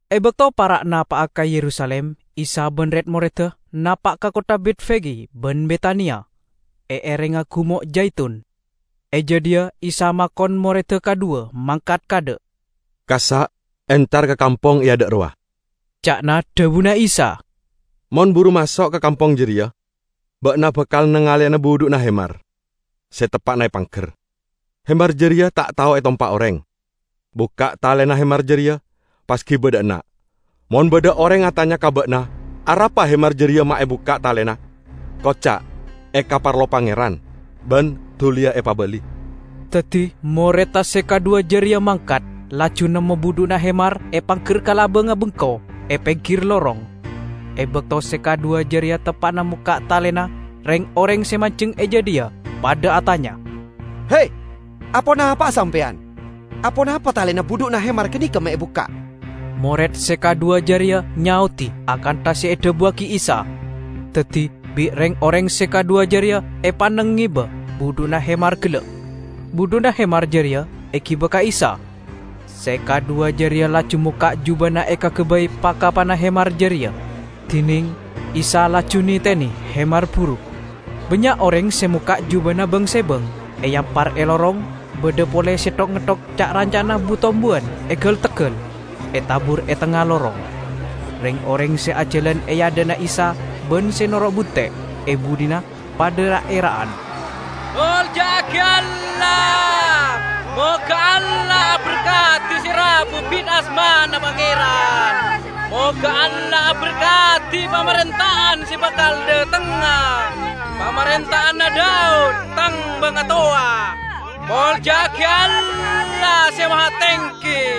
E bakto para' napa'a ka Yerusalim, Isa ban red-moredda napa' ka kottha Betfage ban Betania, e erengnga Gumo' Jaitun. E jadhiya Isa makon moredda kadhuwa mangkat kaadha'. "Kassa' entar ka kampong e adha' rowa," ca'na dhabuna Isa. "Mon buru maso' ka kampong jareya ba'na bakal nangaleyana budhu'na hemar se teppa'na epangger; hemar jareya ta' tao etompa' oreng. Bukka' talena hemar jareya, pas giba dha' enna'. Mon badha oreng atanya ka ba'na arapa hemar jareya ma' ebukka' talena, koca', 'Ekaparlo Pangeran, ban duliya epabali.' " Daddi moredda se kadhuwa jareya mangkat, laju nemmo budhu'na hemar epangger ka labangnga bengko e penggir lorong. E bakto se kadhuwa jareya teppa'na mokka' talena, reng-oreng se manjeng e jadhiya padha atanya, "He, aponapa'a sampeyan? Aponapa talena budhu'na hemar ganeka me' ebukka'?" Mored se kadhuwa jareya nyaodi akantha se edhabuwagi Isa. Daddi bi' reng-oreng se kadhuwa jareya epanneng ngeba budhu'na hemar gella'. Budhu'na hemar jareya egiba ka Isa. Se kadhuwa jareya laju mokka' jubana ekagabay pa-kapana hemar jareya, dineng Isa laju netene hemar buru. Bannya' oreng se mokka' jubana bang-sebang, eampar e lorong, badha pole se ngetthok ca'-ranca'na bu-tombuwan e gal-teggal, etabur e tengnga lorong. Reng-oreng se ajalan e adha'na Isa ban se noro' bunte' e budhina padha ra'-era'an, "Molja'agi Allah! Moga Allah aberkadi se rabu bit asmana Pangeran! Moga Allah aberkadi pamarenta'anna se bakal dhatengnga, pamarenta'anna Daud tang bangatowa! Molja'agi Allah Se Mahatenggi!"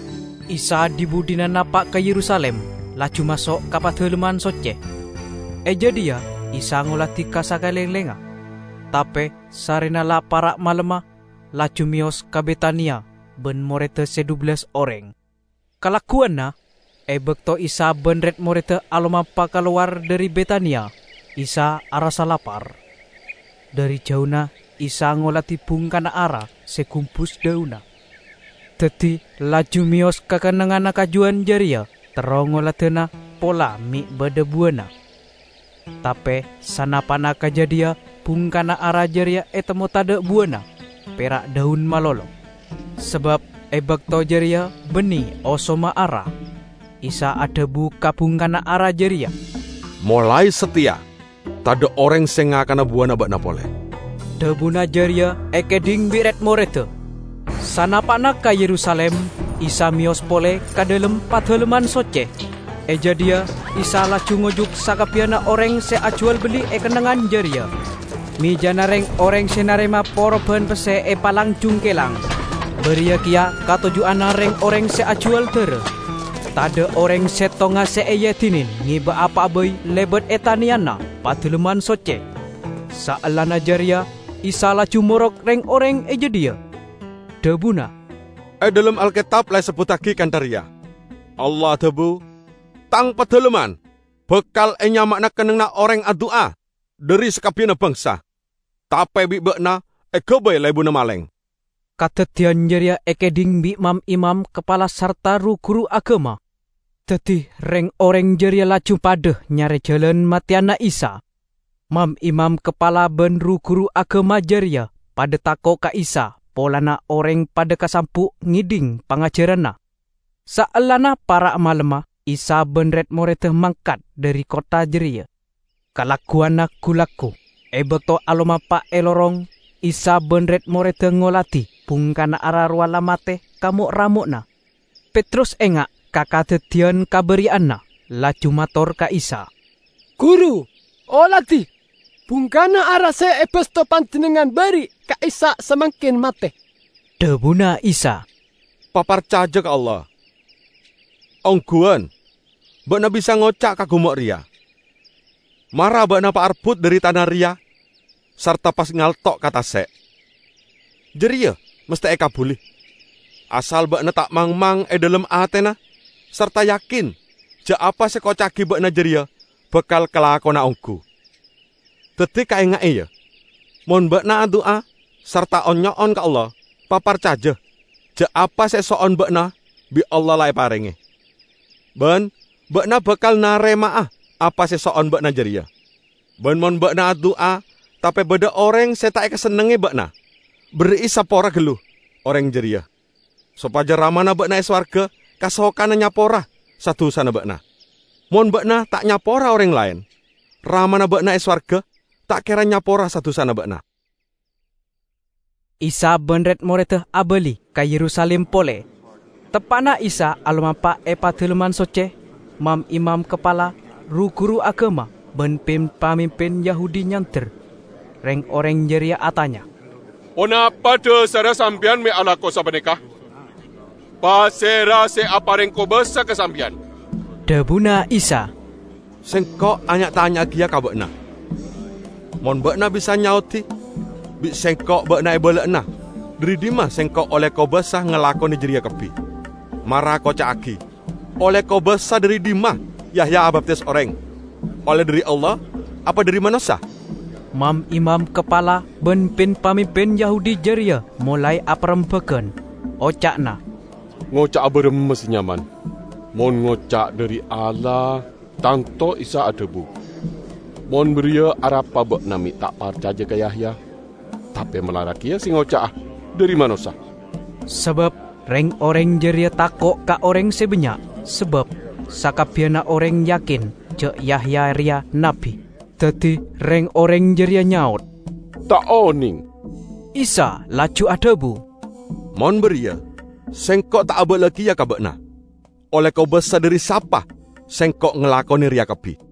Isa dhi-budhina napa' ka Yerusalim, laju maso' ka Padalemman Socce. E jadhiya Isa ngoladi ka sakalenglengnga. Tape sarrena la para' malemma, laju meyos ka Betania ban moredda se dhubellas oreng. Kalagguwanna, e bakto Isa ban red-moredda alomampa kalowar dhari Betania, Isa arassa lapar. Dhari jauna Isa ngoladi bungkana ara se gumbus dhaunna, daddi laju meyos ka kennengnganna kajuwan jareya terro ngoladana pola me' badha buwana. Tape sanapa'na ka jadhiya bungkana ara jareya etemmo tadha' buwana, pera' dhaun malolo, sabab e bakto jareya banne osomma ara. Isa adhabu ka bungkana ara jareya, "Molae sateya tadha' oreng se ngakana buwana ba'na pole!" Dhabuna jareya ekaedhing bi' red-moredda. Sanapa'na ka Yerusalim, Isa meyos pole ka dhalem Padalemman Socce. E jadhiya Isa laju ngojuk sakabbiyanna oreng se ajuwal-belli e kennengngan jareya. Mejana reng-oreng se narema poroban pesse epalang-jungkelang, bariya keya katoju'anna reng-oreng se ajuwal dara. Tadha' oreng settonga se eedine ngeba apa'a bai lebat e taneyanna Padalemman Socce. Saellana jareya Isa laju morok reng-oreng e jadhiya. Dhabuna, "E dhalem Alketab la esebbuttagi kantha reya: Allah adhabu, 'Tang Padalemman bakal enyama'ana kennengnganna oreng adu'a dhari sakabbiyanna bangsa.' Tape bi' ba'na egabay lebunna maleng." Kadaddiyan jareya ekaedhing bi' mam-imam kapala sarta ru-guru agama, daddi reng-oreng jareya laju padha nyare jalan mateyana Isa. Mam-imam kapala ban ru-guru agama jareya padha tako' ka Isa polana oreng padha kasambu' ngedhing pangajaranna. Saellana para' malemma, Isa ban red-moredda mangkat dhari kottha jareya. Kalagguwanna gu-laggu, e bakto alomampa e lorong, Isa ban red-moredda ngoladi bungkana ara rowa la mate ka mo'-ramo'na. Petrus enga' ka kadaddiyan kaba'ari'anna, laju mator ka Isa, "Guru, oladi! Bungkana ara se ebasto Panjennengngan ba'ari' ka'issa' samangken mate." Dhabuna Isa, "Paparcaja ka Allah. Ongguwan, ba'na bisa ngoca' ka gumo' reya, 'Mara ba'na paarbut dhari tana reya sarta pas ngalto' ka tase'!' jareya masthe ekabbuli, asal ba'na ta' mangmang e dhalem atena sarta yakin ja' apa se ekoca'agi ba'na jareya bakal kalakona onggu. Daddi, kaenga'e, ya: Mon ba'na adu'a sarta on-nyo'on ka Allah, paparcaja ja' apa se eso'on ba'na bi' Allah la eparenge, ban ba'na bakal narema'a apa se eso'on ba'na jareya. Ban mon ba'na adu'a, tape badha oreng se ta' ekasennengnge ba'na, berri'i sapora gallu oreng jareya, sopaja Ramana ba'na e sowarga kasokana nyapora sa-dusana ba'na. [ Mon ba'na ta' nyapora oreng laen, Ramana ba'na e sowarga ta' kera nyapora sa-dusana ba'na.]" Isa ban red-moredda abali ka Yerusalim pole. Teppa'na Isa alomampa e Padalemman Socce, mam-imam kapala, ru-guru agama ban pin-pamimpin Yahudi nyander. Reng-oreng jareya atanya, "Ponapa dhasarra sampeyan me' alako sapaneka? Pasera se apareng kobasa ka sampeyan?" Dhabuna Isa, "Sengko' anya'-tanya'a keya ka ba'na. Mon ba'na bisa nyaodi, bi' Sengko' ba'na ebala'ana dhari dhimma Sengko' olle kobasa ngalakone jareya kabbi. Mara koca'agi, olle kobasa dhari dhimma Yahya abaptis oreng: olle dhari Allah apa dhari manossa?" Mam-imam kapala ban pin-pamimpin Yahudi jareya molae aparembagan. Oca'na, "Ngoca'a baramma se nyaman? Mon ngoca' 'Dhari Allah', tanto Isa adhabu, 'Mon bariya, arapa ba'na me' ta' parcaja ka Yahya?' Tape malarat keya se ngoca'a, 'Dhari manossa' ". Sabab reng-oreng jareya tako' ka oreng se bannya', sabab sakabbiyanna oreng yakin ja' Yahya reya nabbi. Daddi reng-oreng jareya nyaot, "Ta' oneng." Isa laju adhabu, "Mon bariya, Sengko' ta' abala'a keya ka ba'na olle kobasa dhari sapa Sengko' ngalakone reya kabbi."